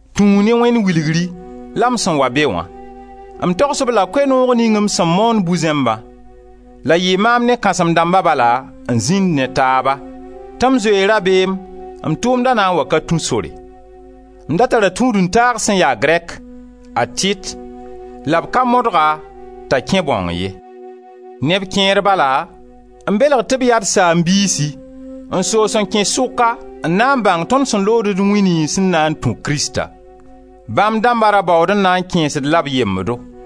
Tũu ne Wẽnd wilgri, la m sẽn wa be wã, m togs-b la Koe-noog ning m sẽn moond bu-zẽmbã — la yɩɩ maam ne kãsem-dãmba bala n zĩnd ne taaba — tɩ m zoe rabeem m tʋʋmda na n wa ka tũ sore. M da tara tũud-n-taag sẽn ya Grɛk, a Tit, la b ka modg-a t'a kẽ bãong ye. Neb kẽer bala n belg tɩ b yaa d saam-biisi n soos n kẽ sʋka n na n bãng tõnd sẽn lood d wĩ niyns n na n tũ Krista; bãmb dãmba ra baood n na n kẽes-d la b yembdo.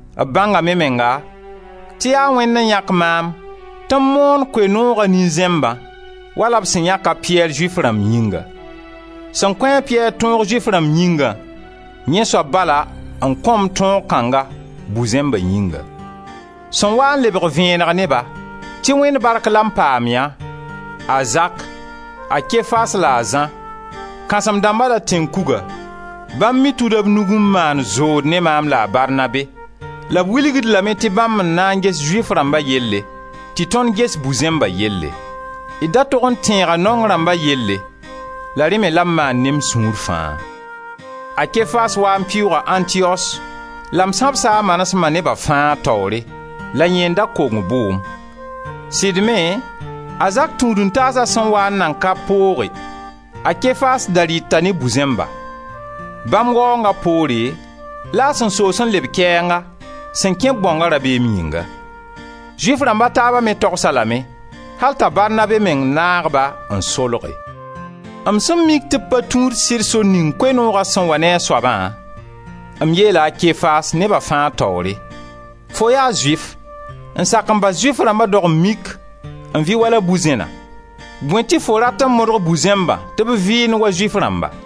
B bãngame menga tɩ yaa Wẽnd n yãk maam tɩ m moon Koe-nooga nin-zẽmbã wala b sẽn yãk a Piyɛr Zʋɩf rãmb yĩnga. Sẽn kõ-a a Piyɛr tõog Zʋɩf rãmba yĩngã, yẽ soab bala n kõ-m tõog kãnga bu-zẽmba yĩnga. Sẽn waa n lebg vẽeneg ne-ba, tɩ Wẽnd bark la m paam yã, a Zak, a Kefas la a Zã, kãsem-dãmba la tẽn-kuga, bãmb me tuda b nug n maan zood ne maam la a Barnabe, la b wilg-d lame tɩ bãmb n na n ges Zʋɩf rãmba yelle tɩ tõnd ges bu-zẽmbã yelle. D da tog n tẽega naong rãmba yelle; la rẽ me la m maan ne m sũur fãa. A Kefas waa n pɩʋʋga Antiyos la m sãbsa a manesem neba fãa taoore, la yẽ n da kong bʋʋm. Sɩd me, a Zak tũud-n-taasa sẽn waa n nan ka pooge, a Kefas ra rɩta ne bu-zẽmba. Bãmb waoonga poore, la a sẽn soos n leb kɛɛnga, sẽn kẽ-b bãonga rabeem yĩnga. Zʋɩf rãmb a taaba me togs-a lame, al t'a Barnabe meng naag-ba n solge. M sẽn mik tɩ b pa tũud sɩd sor ning Koe-nooga sẽn wa ne a soabã, m yeela a Kefas, neba fãa taoore: «Fo yaa Zʋɩf, n sak n bas Zʋɩf rãmba dog-n-mik n vɩ wala bu-zẽna, bõe tɩ fo rat n modg bu-zẽmbã tɩ b vɩɩnd wa Zʋɩf rãmba?»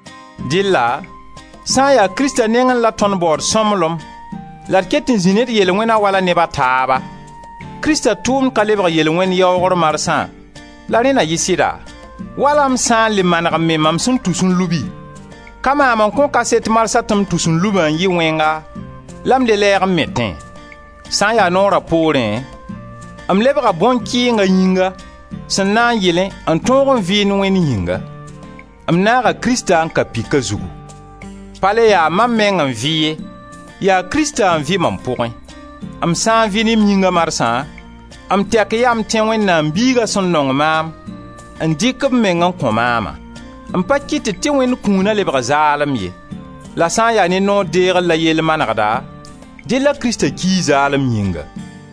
Dɩlla sã n ya Krista nengẽ la tõnd baood sõmblem la d ket n zĩ ne d yel-wẽna wala neb a taaba, Krista tʋʋmd ka lebg yel-wẽnd yaoogr marsã, la rẽ na yɩ sɩda? Wala m sã n le maneg n me mam sẽn tus n lubi, ka maam n kõ kaset marsã tɩ m tus-n-lubã n yɩ wẽnga la m le lɛɛg n metẽ. Sã n ya noora poorẽ, m lebga bõn-kɩɩng a yĩnga, sẽn na n yɩlẽ n tõog n vɩɩnd Wẽnd yĩnga. M naaga Krista n ka pika zugu. Pa le ya mam meng n vɩ ye, yaa Krista n vɩ mam pʋgẽ, m sã n vɩ ne m yĩnga marsã, m tɛk yaa m tẽ Wẽnnaam Biiga sẽn nong maam, n dɩk b meng n kõ maama. M pa kɩtd tɩ Wẽnd kũuna lebg zaalem ye; la sã n ya ne noor deegr la yell manegda, dɩlla Krista ki zaalem yĩnga.